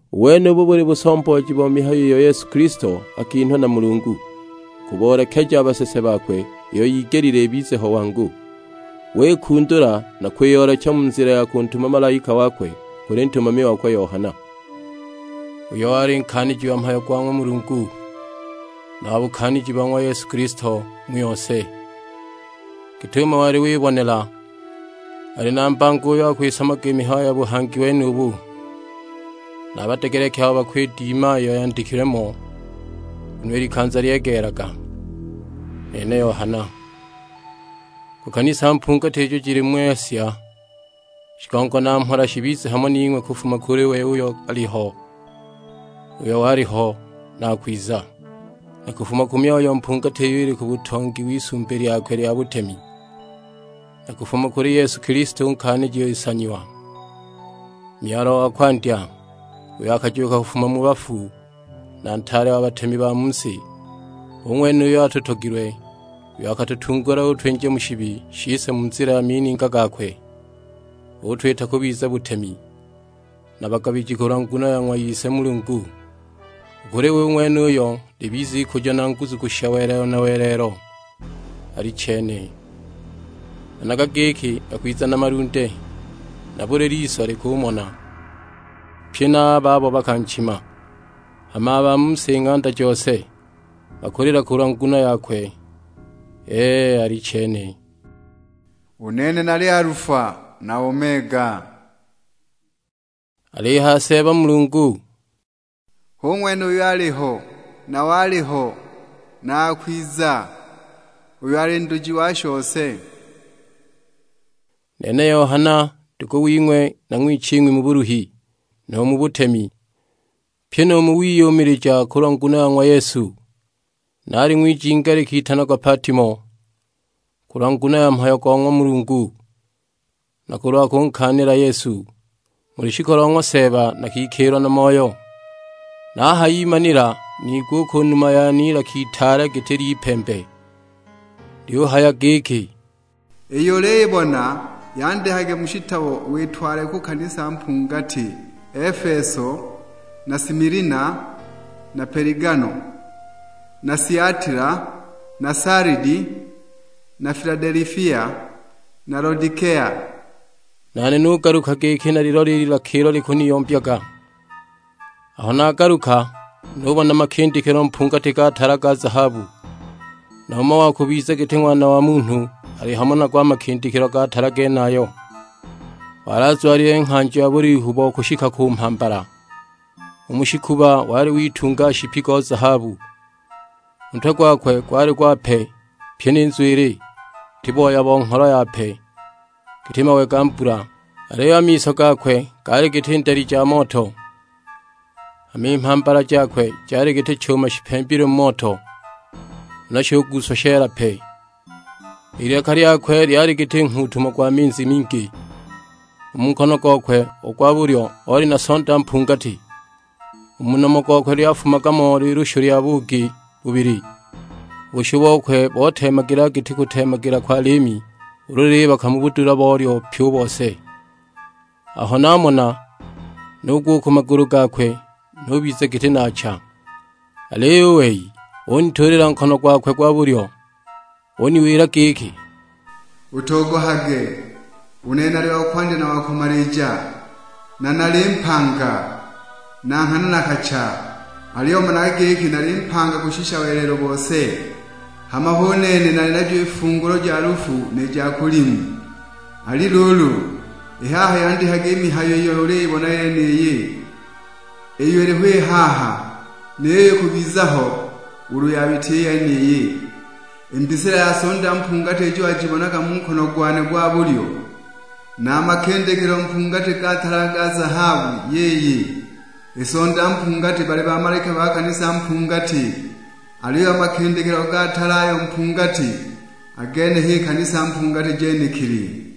U wenubu buli busombooji bo mihayo iyo Yesu Kilisto akinhwa na Mulungu, kuboolekeja a basese bakwe iyo yigelile ibize ho wangu. Wikundula na kwiyoolecha mu nzila ya kuntuma malaika wakwe kuli ntumami wakwe Yohana, uyo wali nkaaniji wa mhayo go ng'wa Mulungu, na wa bukaaniji bo ng'wa Yesu Kilisto mu yose, git'umo wali wibonela. Ali na mbango uyo akwisoma i mihayo ya buhangi wenubu, na a badegeleki abo bakwidima iyo yandikilwe mo; nguno i likanza lyegeelaga. Nene Yohana: Ku kanisa mpungati ijo jili mu Asia; shigongo na mhola shibize hamo ning'we kufuma kuli we uyo aliho, uyo waliho, na akwiza. Na kufuma ku myoyo mpungati iyo ili ku butongi w'Isumbi lyakwe lya butemi. Na kufuma kuli Yesu Kilisto u Nkaaniji Nsanyiwa, Myalwa wa kwandya, uyo akajuuka kufuma mu bafu, na Ntaale wa batemi ba mu si. Hu ng'wene uyo atutogilwe, uyo akatutungula utwinja mu shibi shise mu nzila ya mininga gakwe; utwita kubiza butemi, na bagabiji kulwa nguno ya ng'wa Ise Mulungu. U kuli we u ng'wenuyo libize ikujo na nguzu kushisha welelo na welelo: Alichene. Managa giki, akwiza na malunde, na buli liso likumona, pye na a babo bakanchima. Hama a ba mu si ng'anda jose, bakulila kulwa nguno yakwe. Ee, alichene! "U nene nali Alufa na Omega," alihaya Seeba Mulungu: "Hu ng'wene uyo aliho, na waliho, na akwiza; uyo ali Nduji wa shose." Nene Yohana, ndugu wing'we na ng'wiching'wi mu buluhi, nu mu butemi; pyi nu mu wiyumilija kulwa nguno ya ng'wa Yesu. Naali ng'wijinga likitanagwa Patimo, kulwa nguno ya mhayo go ng'wa Mulungu, na kulwa kunkaanila Yesu. Mu lushiku lo ng'wa Seeba nakikiilwa na Moyo, nahayimanila niigwa u ku numa yane ilaka itaale giti ly'ipembe. Lyuhaya giki, "Iyo uliyibona yandikage mu shitabo witwale ku kanisa mpungati: Efeso, na Similina, na Peligamo, na Siatila, na Salidi, na Filadelifia, na Lodikea." Nane nugaluka giki nalilole i lilaka ilo likuniyombyaga. Aho nagaluka, nubona makindikilo mpungati ga tala ga zahabu, na umo wa kubiza giti Ng'wana wa Munhu ali hamo nago a makindikilo ga tala genayo. Wali azwalile nghanjo ya bulihu bo kushika ku mhambala; u mu shikuba wali witunga nshipi go zahabu. U ntwe gwakwe gwali gwape, pyi ni nzwili, giti booya bo ngholo yape, giti mawe ga mbula; aliyo a miso gakwe gaali giti ndali ja moto. Hama i mhambala jakwe jali giti chuma shipembilwe mu moto, huna shuguuswa sheela pe. I lilaka lyakwe lyali giti nghuutumo gwa minzi mingi. U mu nkono gokwe u gwa bulyo oli na Sonda mpungati; u mu nomo gokwe lyafumaga mo lilushu lya buugi bubili, u bushu bokwe boteemagilaga giti kuteemagila kwa liimi ulu lilibaka mu budula bolyo pyi u bose. Aho namona, nugwa u ku magulu gakwe, nubiza giti naacha! Aliyo u wei unituulila nkono gwakwe gwa bulyo; uniwila giki, "Utogohage, u nene nali wa Kwandya na wa Kumalija, na nali Mpanga; na nghana nakacha, aliyo managa giki nali mpanga kushisha welelo bose. Hama hu nene nali najo i fungulo ja lufu ni ja kulimu. Ali luulu, i haha yandikage i mihayo iyo uliyibona yeniyi, iyo iliho i haha, ni yiyo ikubiza ho ulu yabita i yeniyi. I mbisila ya Sonda mpungati ijo wajibonaga mu nkono gwane gwa bulyo, na a makindikilo mpungati ga tala a ga zahabu, yiyi: I Sonda mpungati bali bamalaika ba kanisa mpungati, aliyo a makindikilo ga tala ayo mpungati, a gene h'i kanisa mpungati jenekili.